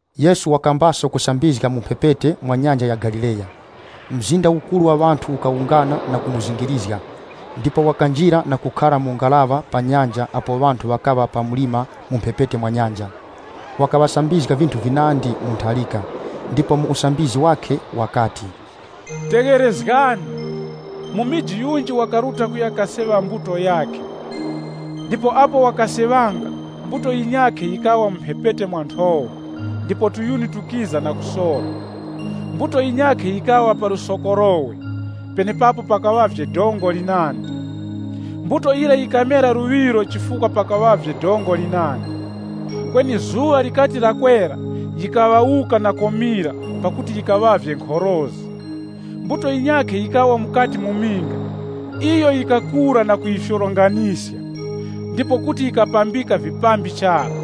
Yesu wakambaso kusambizga mu mphepete mwa Nyanja ya Galileya. Mzinda ukuru wa ŵanthu ukawungana na kumuzingirizga, ndipo wakanjira na kukhara mu ngaraŵa pa nyanja apo ŵanthu ŵakaŵa pa mlima mu mphepete mwa nyanja. Wakaŵasambizga vinthu vinandi mu ntharika, ndipo mu usambizgi wakhe wakati, “Tegherezgani! Mumiji yunji wakaruta kuya kaseŵa mbuto yakhe. Ndipo apo wakaseŵanga, mbuto yinyakhe yikawa mu mphepete mwa nthowa, ndipo tuyuni tukiza na kusora. Mbuto yinyakhe yikawa pa lusokorowe, penepapo pakaŵavye dongo linandi. Mbuto yira yikamera luŵiro chifukwa pakaŵavye dongo linandi. Kweni dazi likati lakwera, yikaŵawuka na komira pakuti yikaŵavye nkhorozi. Mbuto yinyakhe yikawa mukati mu minga, iyo yikakura na kuyifyoronganiska, ndipo kuti yikapambika vipambi chara.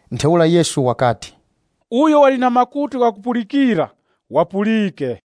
Ntheura Yesu wakati, “Uyo wali na makutu ghakupulikira, wapulike.”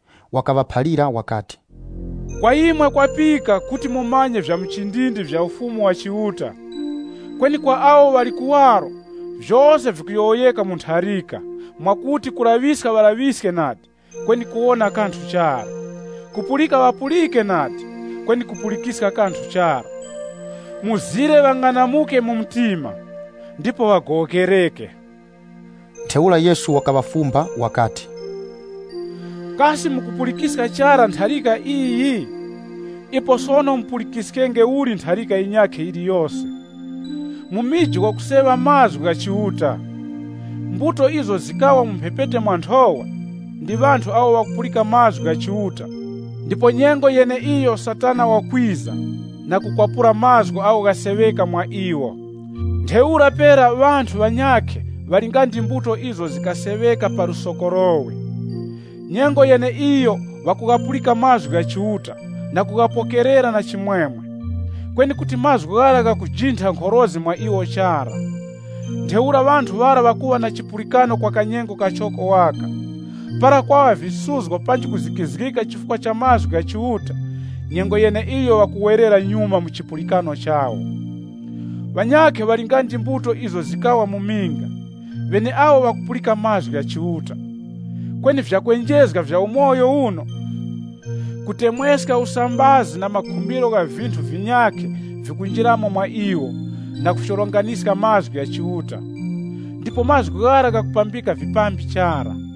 Wakaŵaphalira wakati, “Kwa imwe kwapika kuti mumanye vya muchindindi vya Ufumu wa Chiuta. Kweni kwa awo ŵali kuwaro, vyose vikuyowoyeka mu ntharika, mwakuti, ‘Kulaŵiska, ŵalaŵiske nadi, kweni ŵawone kanthu chara, Kupulika ŵapulike nadi, kweni kupulikiska kanthu chara. Mzire ŵang'anamuke mu mtima, ndipo ŵagowokereke!’” (LXX) Ntheura Yesu wakaŵafumba wakati, “Kasi mukupulikiska chara ntharika iyi? Ipo sono mupulikiskenge uli ntharika yinyakhe yiliyose? Mumiji wakuseŵa mazgu gha Chiuta. Mbuto izo zikawa mu mphepete mwa nthowa, ndi ŵanthu awo ŵakupulika mazgu gha Chiuta ndipo nyengo yeneiyo Satana wakwiza na kukwapura mazgu agho ghaseŵeka mwa iwo. Ntheura pera ŵanthu ŵanyakhe ŵali nga ndi mbuto izo zikaseŵeka pa lusokorowe. Nyengo yeneiyo ŵakughapulika mazgu gha Chiuta na kughapokerera na chimwemwe. Kweni kuti mazgu ghara ghakujintha nkhorozi mwa iwo chara. Ntheura ŵanthu ŵara ŵakuŵa na chipulikano kwa kanyengo kachoko waka. Para kwaŵa visuzgo panji kuzikizgika chifukwa cha mazgu gha Chiuta, nyengo yeneiyo ŵakuwerera nyuma mu chipulikano chawo. Ŵanyakhe ŵali nga ndi mbuto izo zikawa mu minga, ŵeneawo ŵakupulika mazgu gha Chiuta. Kweni vyakwenjezga vya umoyo uno, kutemweska usambazi na makhumbiro gha vinthu vinyakhe vikunjiramo mwa iwo na kufyoronganiska mazgu gha Chiuta. Ndipo mazgu ghara ghakupambika vipambi chara.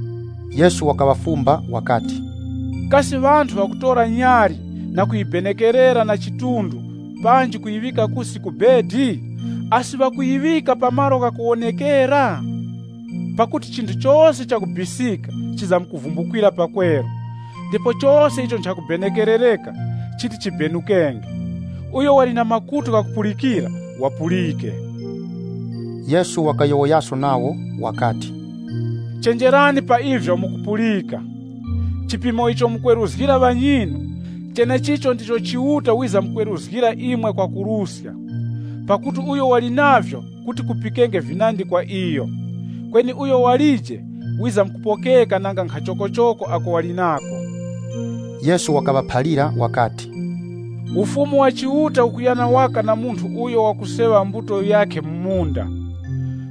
Yesu wakaŵafumba wakati, “Kasi ŵanthu ŵakutora nyali na kuyibenekerera na chidunga panji kuyiŵika kusi ku chitara? Asi ŵakuyiŵika pa malo ghakuwonekera? Pakuti chinthu chose chakubisika chizamkuvumbukwira pakweru, ndipo chose icho nchakubenekerereka chiti chibenukenge. Uyo wali na makutu ghakupulikira, wapulike!” Yesu wakayowoyaso nawo wakati, “Chenjerani pa ivyo mukupulika! Chipimo icho mukweruzgira ŵanyinu, chenechicho ndicho Chiuta wizamkweruzgira imwe kwakuruska. Pakuti uyo wali navyo kuti kupikenge vinandi kwa iyo. Kweni uyo walije, wizamkupokeka nanga nkhachokochoko ako wali nako.” Yesu wakaŵaphalira wakati, “Ufumu wa Chiuta ukulingana waka na munthu uyo wakuseŵa mbuto yakhe mu munda.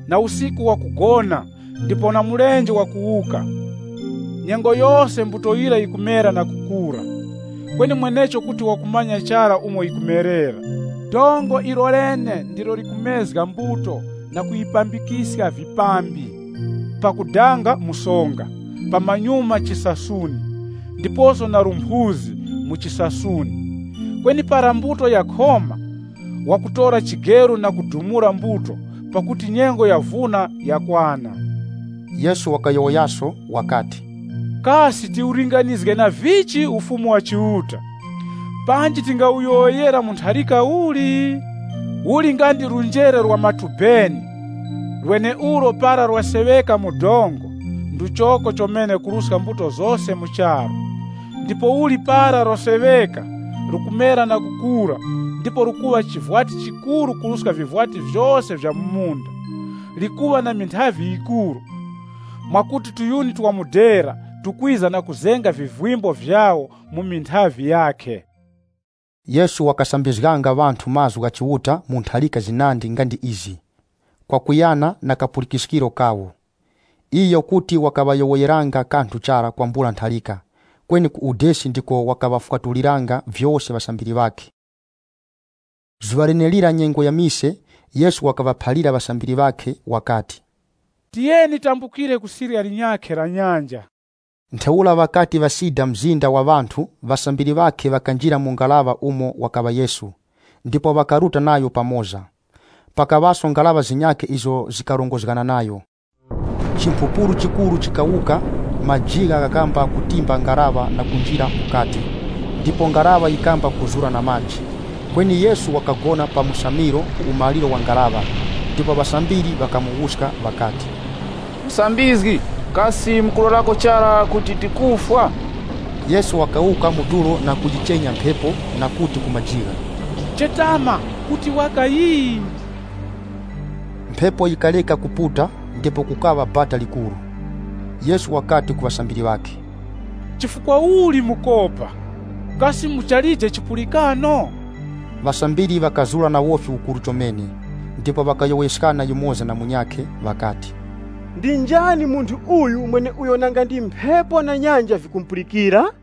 Na usiku wakugona ndipo na mulenje wakuwuka. Nyengo yose mbuto yira yikumera na kukura. Kweni mwenecho kuti wakumanya chara umo yikumerera. Dongo ilolene ndilo likumezga mbuto na kuyipambikiska vipambi, pakudanga musonga, pamanyuma chisasuni, ndiposo na lumphuzi mu chisasuni. Kweni para mbuto yakhoma, wakutora chigeru na kudumula mbuto pakuti nyengo yavuna yakwana.” Yesu wakayowoyaso wakati, “Kasi tiwulinganizge na vichi Ufumu wa Chiuta? Panji tingawuyowoyera mu ntharika uli? Uli nga ndi njere la matubeni ulo para laseŵeka mu dongo, nduchoko chomene kuruska mbuto zose mu charu. Ndipouli para laseŵeka, lukumera na kukura ndipo lukuŵa chivwati chikuru kuruska vivwati vyose vya mu munda. Likuŵa na minthavi yikuru, mwakuti viyuni vya mudera vikwiza na kuzenga vivimbo vyawo mu minthavi yakhe.” Yesu wakasambizganga ŵanthu mazgu gha Chiuta mu ntharika zinandi nga ndi izi, kwakuyana na kapulikiskiro kawo. Iyo kuti wakaŵayowoyeranga kanthu chara kwambula ntharika. Kweni ku udesi ndiko wakaŵafwatuliranga vyose ŵasambiri ŵakhe. Zuŵa lenelira nyengo ya mise, Yesu wakaŵaphalira ŵasambiri ŵakhe wakati, “Tiyeni tambukire ku sirya linyakhe la nyanja.” Ntheura ŵakati ŵasida mzinda wa ŵanthu, ŵasambiri ŵakhe ŵakanjira mu ngaraŵa umo wakaŵa Yesu, ndipo ŵakaruta nayo pamoza. Pakaŵaso ngaraŵa zinyakhe izo zikarongozgana nayo. Chimphupuru chikuru chikawuka, majigha ghakamba kutimba ngaraŵa na kunjira mukati, ndipo ngaraŵa yikamba kuzura na maji. Kweni Yesu wakagona pa musamiro ku umaliro wa ngaraŵa, ndipo ŵasambiri ŵakamuwuska ŵakati, “Musambizgi, kasi mukulorako chara kuti tikufwa?” Yesu wakawuka mu tulo na kuyichenya mphepo na kuti ku majigha, “Chetama! Kuti waka yii.” Mphepo yikareka kuputa ndipo kukaŵa bata likuru. Yesu wakati ku ŵasambiri ŵakhe, “Chifukwa uli mukopa? Kasi muchalije chipulikano?” Ŵasambiri ŵakazura na wofi ukuru chomene, ndipo ŵakayowoyeskana yumoza na munyakhe ŵakati, “Ndi njani munthu uyu mweneuyo nanga ndi mphepo na nyanja vikumupulikira?”